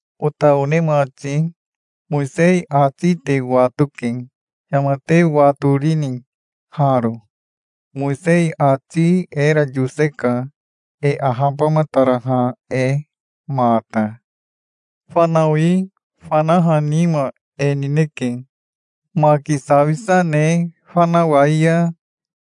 Ota one mati, Mowisei ati te watoke. Yama te watorini haro? Mowisei ati era yoseka, e ahabamataraha e mata. Fanawi fanaha nima e nineke. Maki sawisa ne fanawai ya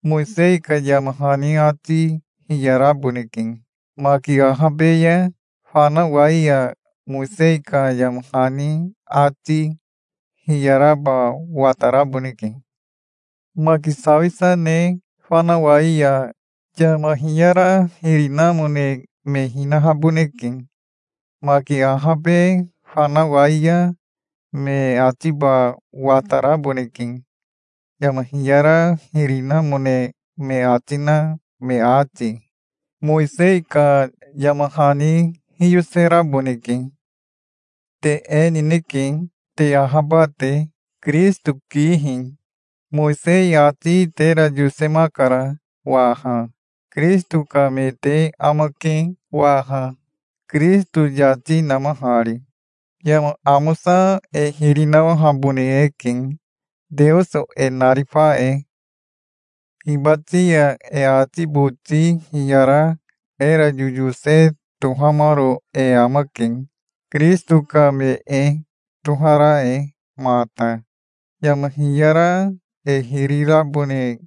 Mowisei ka yama hani ati hiyaraboneke. Maki ahabe ya fanawai ya Mowisei ka yama hani ati hiyaraba wataraboneke. Maki sawisa ne fanawai ya yama hiyara hiri namone me hinahaboneke. Maki ahabe fanawai ya me atiba wataraboneke, yama hiyara hiri namone me ati na me ati. Mowisei ka yama hani hiyoseraboneke. Te e nineke, te ahaba te, Kirisito kihi. Mowisei ati tera yosemakara waha. Kirisito ka me te amake waha, Kirisito yati namahari. Yama amosa e hiri nawahabone eke Teoso e narifa e. Hibati ya e ati boti hiyara era yoyose tohamaro e amake, Kirisito ka me e tohara e mata. Yama hiyara e hiri rabone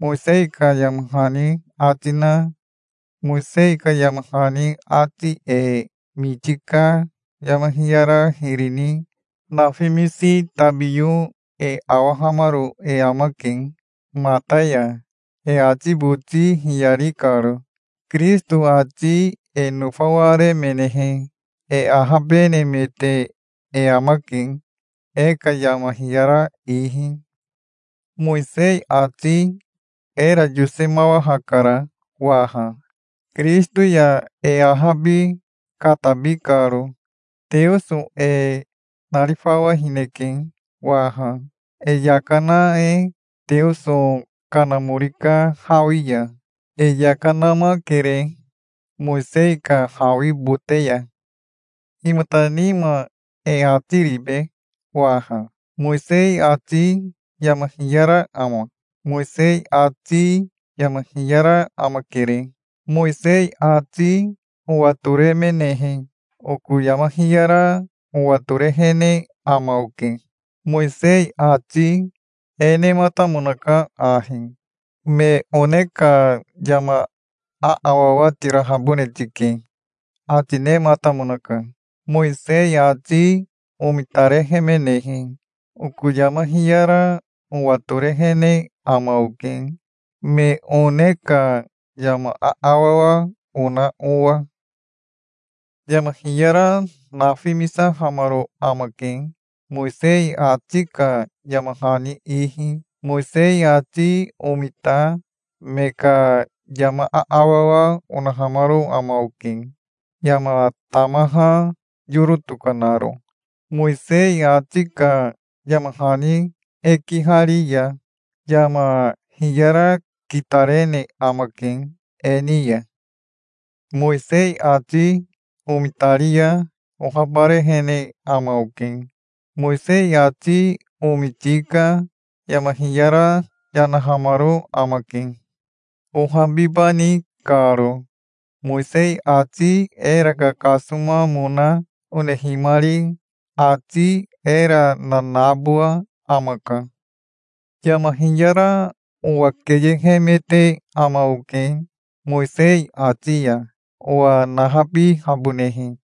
Mowisei ka yama hani ati na Mowisei ka yama hani ati e miti ka yama hiyara hiri ni nafimisi tabiyo e awahamaro e amake mata ya, e ati boti hiyari karo. Kirisito ati e nofawaremenehe e ahabenemete e amake e ka yama hiyara ihi. Mowisei ati era yosemawahakara waha, Kirisito ya e ahabi katabi karo. Teoso e narifawahineke waha, e yaka na e Teoso Kanamori ka hawi ya. E yaka namakere Mowisei ka hawi bote ya. Himata nima e ati ribe waha? Mowisei ati yama hiyara ama? Mowisei ati yama hiyara amakere. Mowisei ati owatoremenehe, oko yama hiyara owatorehene ama oke. Mowisei ati e nematamonaka ahi: "Me one ka yama aawawa tirahabone tike", ati nematamonaka. Mowisei ati omitarehemenehe, oko yama hiyara owatorehene ama oke, me one ka yama aawawa ona owa. Yama hiyara nafimisahamaro amake Mowisei ati ka yama hani ihi. Mowisei ati omita me ka yama aawawa onahamaro ama oke, yama tamaha yoro tokanaro. Mowisei ati ka yama hani e kihari ya yama hiyara kitarene amake e ni ya. Mowisei ati omitari ya ohabarehene ama oke. Mowisei ati omiti ka yama hiyara yanahamaro amake, ohabibani karo. Mowisei ati era kakasomamona onehimari ati era nanabowa amaka. Yama hiyara owa keyehemete ama oke Mowisei ati ya, owa nahabihabonehe.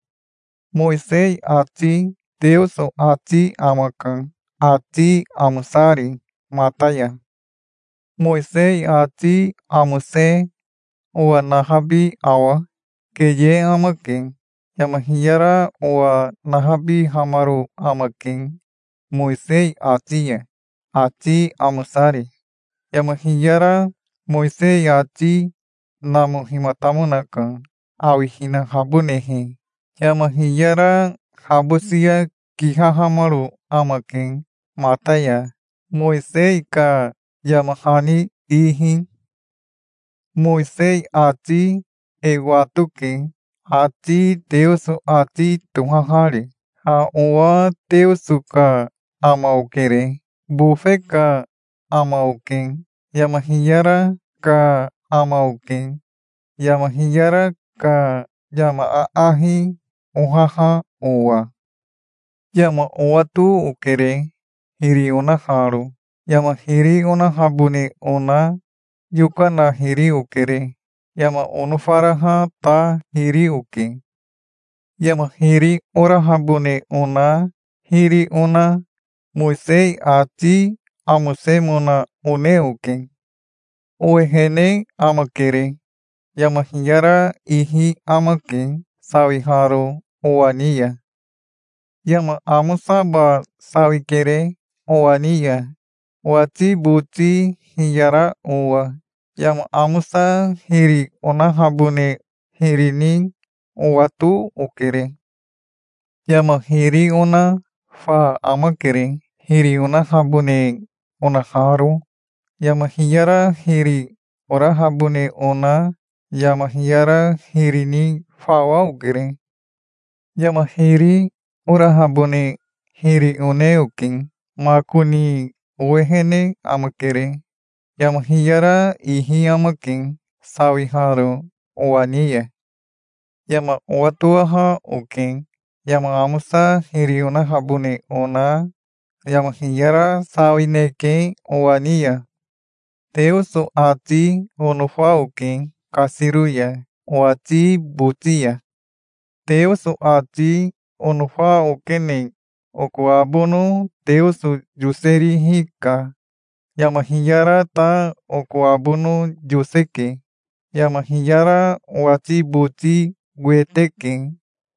Mowisei ati Teoso ati amaka, ati amosari mata ya. Mowisei ati amose owa nahabi awa? Keye amake. Yama hiyara owa nahabihamaro amake Mowisei ati ya, ati amosari. Yama hiyara Mowisei ati namohimatamonaka, awihinahabonehe. Yama hiyara habosia kihahamaro amake mata ya, Mowisei ka yama hani ihi. Mowisei ati e watoke, ati Teoso ati tohahari. Ha owa Teoso ka ama okere. Bofe ka ama oke. Yama hiyara ka ama oke, yama hiyara ka yama aahi ohaha owa. Yama owato okere, hiri onaharo. Yama hiri onahabone ona yokana hiri okere. Yama onofaraha ta hiri oke. Yama hiri orahabone ona hiri ona, Mowisei ati amosemona one oke. Owehene amakere. Yama hiyara ihi amake, sawiharo owa ni ya. Yama amosaba sawikere owa ni ya, owati boti hiyara owa. Yama amosa hiri onahabone hiri ni owato okere. Yama hiri ona fa amakere, hiri onahabone onaharo. Yama hiyara hiri orahabone ona yama hiyara hiri ni fawa okere. Yama hiri orahabone hiri one oke. Makoni owehene amakere. Yama hiyara ihi amake, sawiharo owa ni ya. Yama owatowaha oke. Yama amosa hiri onahabone ona yama hiyara sawineke owa ni ya. Teoso ati onofa oke kasiro ya owati boti ya. Teoso ati onofa okene oko abono Teoso yoserihi ka. Yama hiyara ta oko abono yoseke. Yama hiyara owati boti wete ke,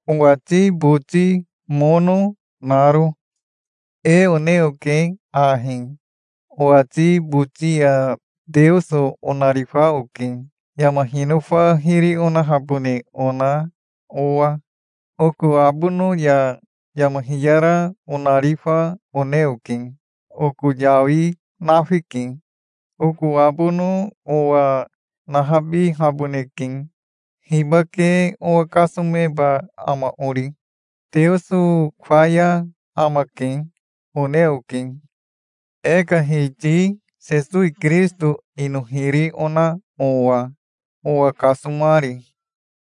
owati boti mono naro. E one oke ahi: Owati boti ya Teoso onarifa oke, yama hinofa hiri onahabone ona owa. Oko abono ya yama hiyara onarifa one oke. Oko yawi nafike. Oko abono owa nahabihaboneke. Hibake owa kasomeba ama ori? Teoso faya amake, one oke, e ka Hiti Sesowi Kirisito ino hiri ona owa, owa kasomari.